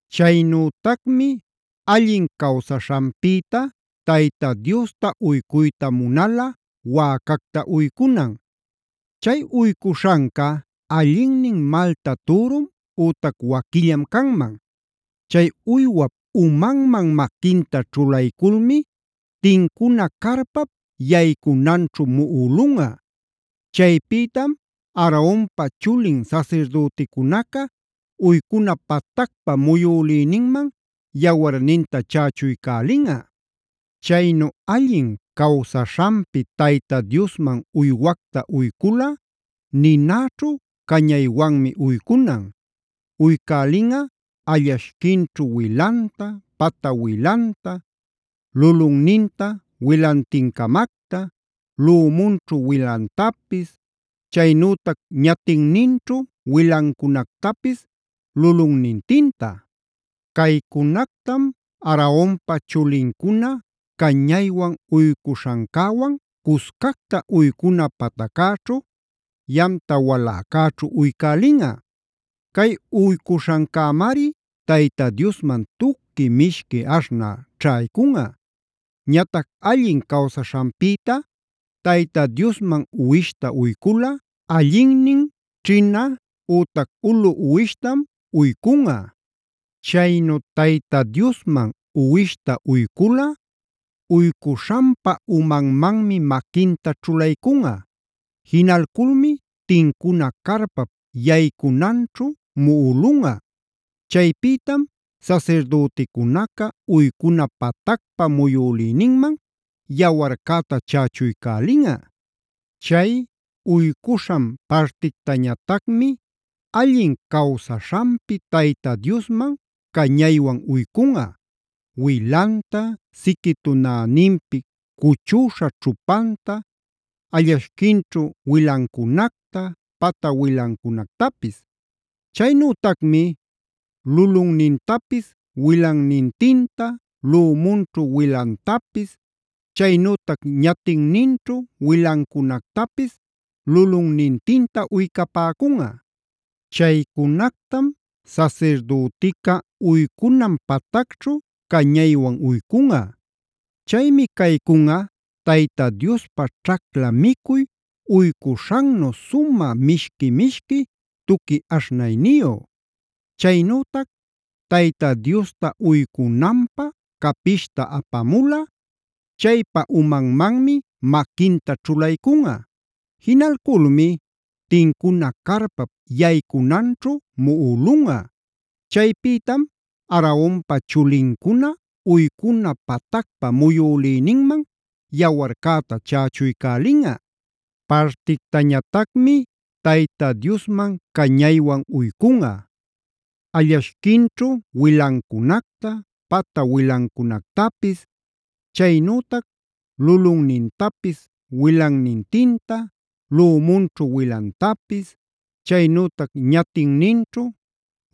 “Chaynütacmi allin cawsaśhanpïta Tayta Diosta uycuyta munalꞌa wäcacta uycunan. Chay uycuśhanca allinnin malta türum ütac waquillam canman. Chay uywap umanman maquinta ćhulayculmi tincuna carpap yaycunanćhu muꞌulunꞌa. Chaypïtam Aaronpa chulin sasirdüticunaca uycuna patacpa muyülïninman yawarninta chächuycälinꞌa. “Chaynu allin cawsaśhanpi Tayta Diosman uywacta uyculꞌa ninäćhu cañaywanmi uycunan. Uycälinꞌa allashquinćhu wilanta, pata wilanta, lulunninta wilantincamacta, lümunćhu wilantapis, chaynütac ñatinninćhu wilancunactapis lulunnintinta. Caycunactam Aaronpa chulincuna cañaywan uycuśhancäwan cuscacta uycuna pataccäćhu, yamta waläcäćhu uycälinꞌa. Cay uycuśhancämari Tayta Diosman tuqui mishqui aśhnä ćhaycunꞌa. “Ñatac allin cawsaśhanpïta Tayta Diosman uwishta uyculꞌa allinnin ćhina ütac ulu uwishtam uycunꞌa. Chaynu Tayta Diosman uwishta uyculꞌa, uycuśhanpa umanmanmi maquinta ćhulaycunꞌa. Jinalculmi tincuna carpap yaycunanćhu muꞌulunꞌa. Chaypïtam sasirdüticunaca uycuna patacpa muyülïninman yawarcäta chächuycälinꞌa. “Chay uycuśhan partictañatacmi allin cawsaśhanpi Tayta Diosman cañaywan uycunꞌa: wilanta, siqui tunäninpi cuchüśha ćhupanta, allashquinćhu wilancunacta, pata wilancunactapis. Chaynütacmi lulunnintapis wilannintinta, lümunćhu wilantapis, chaynütac ñatinninćhu wilancunactapis lulunnintinta uycapäcunꞌa. Chaycunactam sasirdütica uycunan patacćhu cañaywan uycunꞌa. Chaymi caycunꞌa Tayta Diospä ćhacla micuy uycuśhannu sumä mishqui-mishqui tuqui aśhnayniyu. “Chaynütac Tayta Diosta uycunanpä capishta apamulꞌa, chaypa umanmanmi maquinta ćhulaycunꞌa. Jinalculmi tincuna carpap yaycunanćhu muꞌulunꞌa. Chaypïtam Aaronpa chulincuna uycuna patacpa muyülïninman yawarcäta chächuycälinꞌa. “Partictañatacmi Tayta Diosman cañaywan uycunꞌa: allashquinćhu wilancunacta, pata wilancunactapis, chaynütac lulunnintapis wilannintinta, lümunćhu wilantapis, chaynütac ñatinninćhu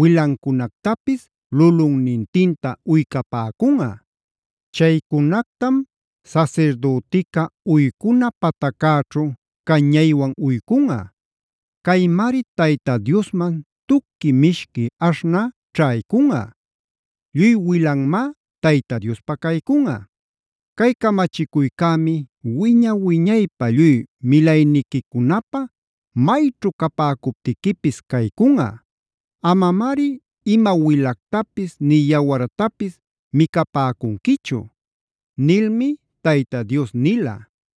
wilancunactapis lulunnintinta uycapäcunꞌa. Chaycunactam sasirdütica uycuna pataccäćhu cañaywan uycunꞌa. Caymari Tayta Diosman tuqui mishqui aśhnä ćhaycunꞌa. Lluy wilanmá Tayta Diospä caycunꞌa. “Cay camachicuycämi wiña-wiñaypä lluy milayniquicunapä mayćhu capäcuptiquipis caycunꞌa: Amamari ima wilactapis nï yawartapis micapäcunquichu” nilmi Tayta Dios nila.